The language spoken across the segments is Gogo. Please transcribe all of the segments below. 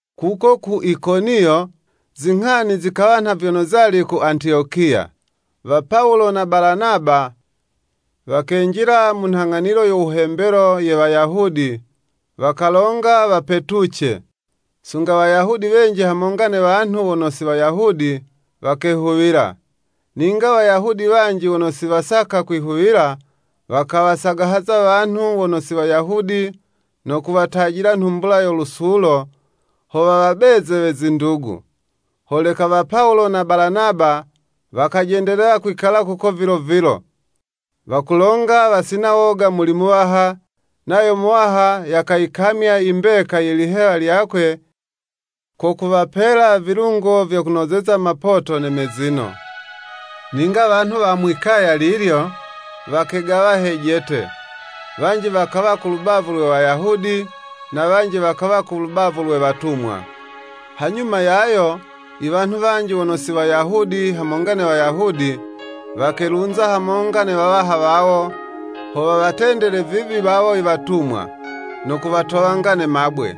Kuko ku Ikoniyo, zinghani zikawa nha vyono zali ku Antiyokiya. Wa Pawulo na Balanaba wakenjila mu nhang'anilo yo wuhembelo ye Wayahudi, wakalonga wapetuce, sunga Wayahudi wenji hamonga ne wanhu wono si Wayahudi, wakehuwila. Ninga Wayahudi wanji wono si wasaka kwihuwila, wakawasagahaza wanhu wono si Wayahudi no kuwatajila nhumbula yo lusulo ho wawabeze we zindugu. Holeka wa Pawulo na Balanaba wakajendelela kwikala kuko vilo vilo. Wakulonga wasina woga muli Muwaha, nayo Muwaha yakayikamya i mbeka ye lihewa lyakwe yono wayiganulaga, ko kuwapela vilungo vyo kunozeza mapoto ne mezino. Ninga wanhu wa mwi'kaya lilyo, wakegawa hejete, wanji wakawa ku lubavu lwe Wayahudi, na wanji wakawa ku lubavu lwe watumwa. Hanyuma yayo, iwanhu wanji wono wi Wayahudi, hamonga ne Wayahudi, wakelunza hamonga ne wawaha wawo, ho wawatendele vibi wawo iwatumwa, no kuwatowanga ne mabwe.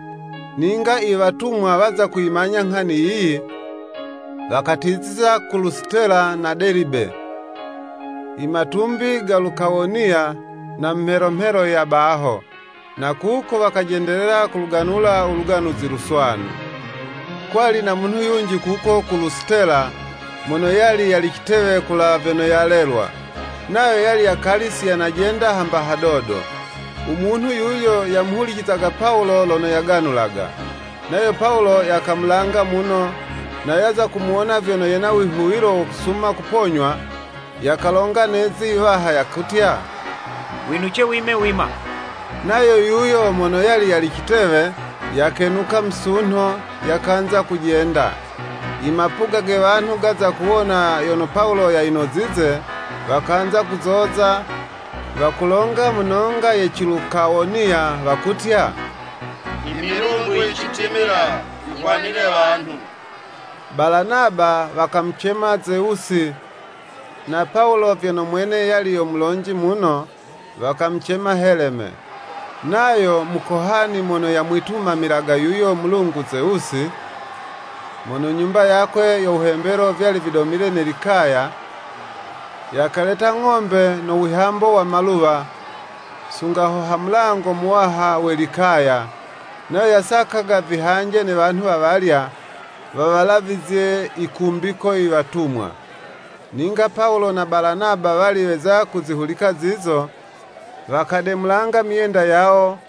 Ninga iwatumwa waza kuyimanya nghani yiyi, wakatiziza ku Lusitela na Delibe, i matumbi ga Lukawoniya, na mu mhelo mhelo ya baho. Na kuko wakajendelela kuluganula u Luganuzi Luswanu. Kwali na munhu yunji kuko ku Lusitela, mono yali yali citewe kulawa vyono yalelwa, nayo yali yakali si yanajenda hamba hadodo. U munhu yuyo, yamuhulicizaga Pawulo lono yaganulaga. Nayo Pawulo yakamulanga muno, na yaza kumuwona vyono yena wihuwilo wo kusuma kuponywa, yakalonga ne'zi iwaha, yakutya, “Winuce wime wima.” Nayo yuyo mono yali yali citewe, yakenuka musunho, yakanza kujenda. Imapuga ge wanhu gaza kuwona yono Pawulo yayinozize, wakanza kuzoza, wakulonga mu nonga ye Cilukawoniya, wakutya, “Imilungu yicitimila yihwanile wanhu.” Balanaba wakamucema Zewusi, na Pawulo, vyono mwene yali yo mulonji muno, wakamucema Heleme. Nayo mukohani mono yamwitumamilaga yuyo mulungu Zewusi, mono nyumba yakwe yo wuhembelo vyali vidomile ne likaya, yakaleta ng'ombe no wihambo wa maluwa, sunga ho ha mulango muwaha we likaya, nayo yasakaga vihanje ne wanhu wawalya, wawalavizye yikumbiko iwatumwa. Ninga Pawulo na Balanaba wali weza kuzihulika zizo, wakademulanga myenda yawo,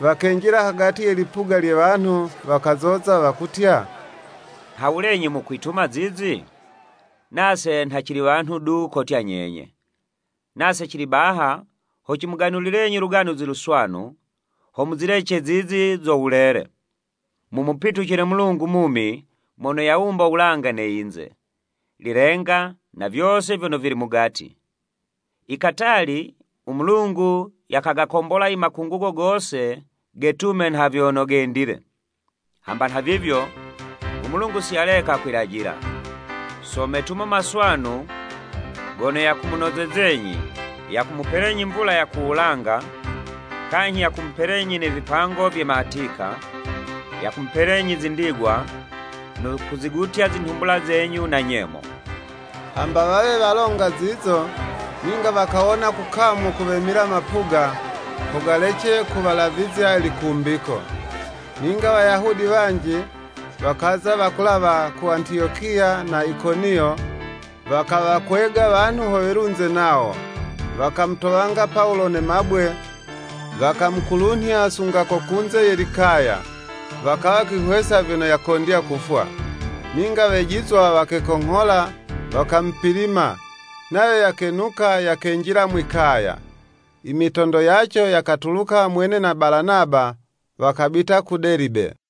wakenjila hagati ye lipuga lye wanhu, wakazoza wakutya, “Nhawulenyi mukwituma zizi? Nase nha cili wanhu du kotya nyenye. Nase cili baha ho cimuganulilenyi Luganuzi Luswanu, ho muzilece zizi zo wulele, mumupitucile Mulungu mumi mono yawumba wulanga ne yinze, lilenga na vyose vyono vili mugati. I katali u Mulungu yagakombola i makungugo gose getume nha vyono gendile. Hamba nhavivyo, u Mulungu si yaleka kwilajila, so metumo maswanu gono yakumunozezenyi, yakumupelenyi mvula ya ku wulanga, kanyhi ya kumupelenyi ne vipango vye matika, yakumupelenyi zi ndigwa, no kuzigutya zinhumbula zenyu na nyemo.” Hamba wawe walonga zizo, ninga wakawona kukamu kuwemila mapuga, ho galece kuwalavizya likumbiko. Ninga Wayahudi wanji, wakaza wakulawa ku Antiyokiya na Ikoniyo wakawakwega wanhu ho welunze nawo, wakamutowanga Pawulo ne mabwe, wakamukulunhya sunga ko kunze ye likaya, wakawa kwihwesa vyono yakondya kufwa. Ninga wejizwa wakekonghola, wakamupilima, nayo yakenuka yakenjila mwikaya. Imitondo yaco yakatuluka, mwene na Balanaba, wakabita ku Delibe.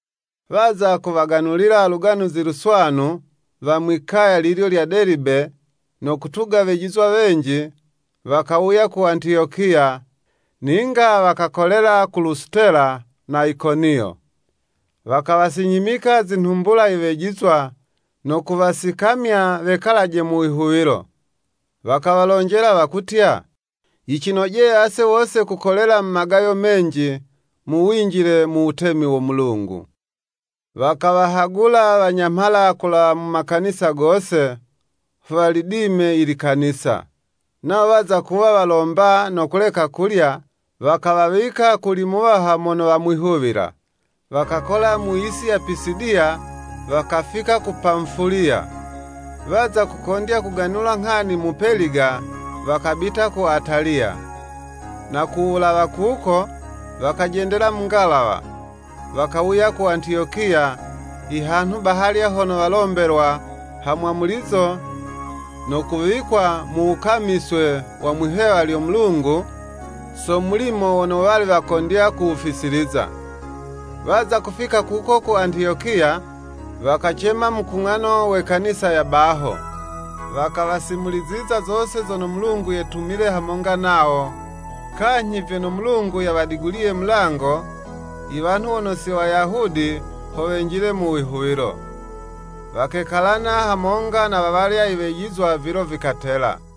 Waza kuwaganulila Luganuzi Luswanu wa mwi'kaya lilyo lya Delibe, no kutuga wejizwa wenji, wakawuya ku Antiyokiya, ninga wakakolela ku Lusitela na Ikoniyo. Wakawasinyhimika zinhumbula i wejizwa, no kuwasikamya wekalaje mu wihuwilo. Wakawalonjela wakutya, “Yicinojeye ase wose kukolela mu magayo menji, mu winjile mu wutemi wo Mulungu.” Wakawahagula wanyamhala kulawa mu makanisa gose, ho walidime i Likanisa. Nawo waza kuwa walomba no kuleka kulya, wakawawika kuli Muwaha mono wamwihuwila. Wakakola mu yisi ya Pisidiya, wakafika ku Pamufuliya. Waza kukondya kuganula nghani mu Peliga, wakabita ku Ataliya, na ku wulawa kuko, wakajendela mu ngalawa, wakawuya ku Antiyokiya, ihanhu bahalya hono walombelwa ha mwamulizo, no kuwikwa mu wukamiswe wa mwi'hewa lyo Mulungu, so mulimo wono wali wakondya kuwufisiliza. Waza kufika kuko ku Antiyokiya, wakacema mukung'ano we Kanisa ya baho. Wakawasimuliziza zose zono Mulungu yetumile hamonga nawo, kanyhi vyono Mulungu yawadiguliye mulango, iwanhu wono si Wayahudi, ho wenjile mu wihuwilo. Wakekalana hamonga na wawalya iwejizwa vilo vikatela.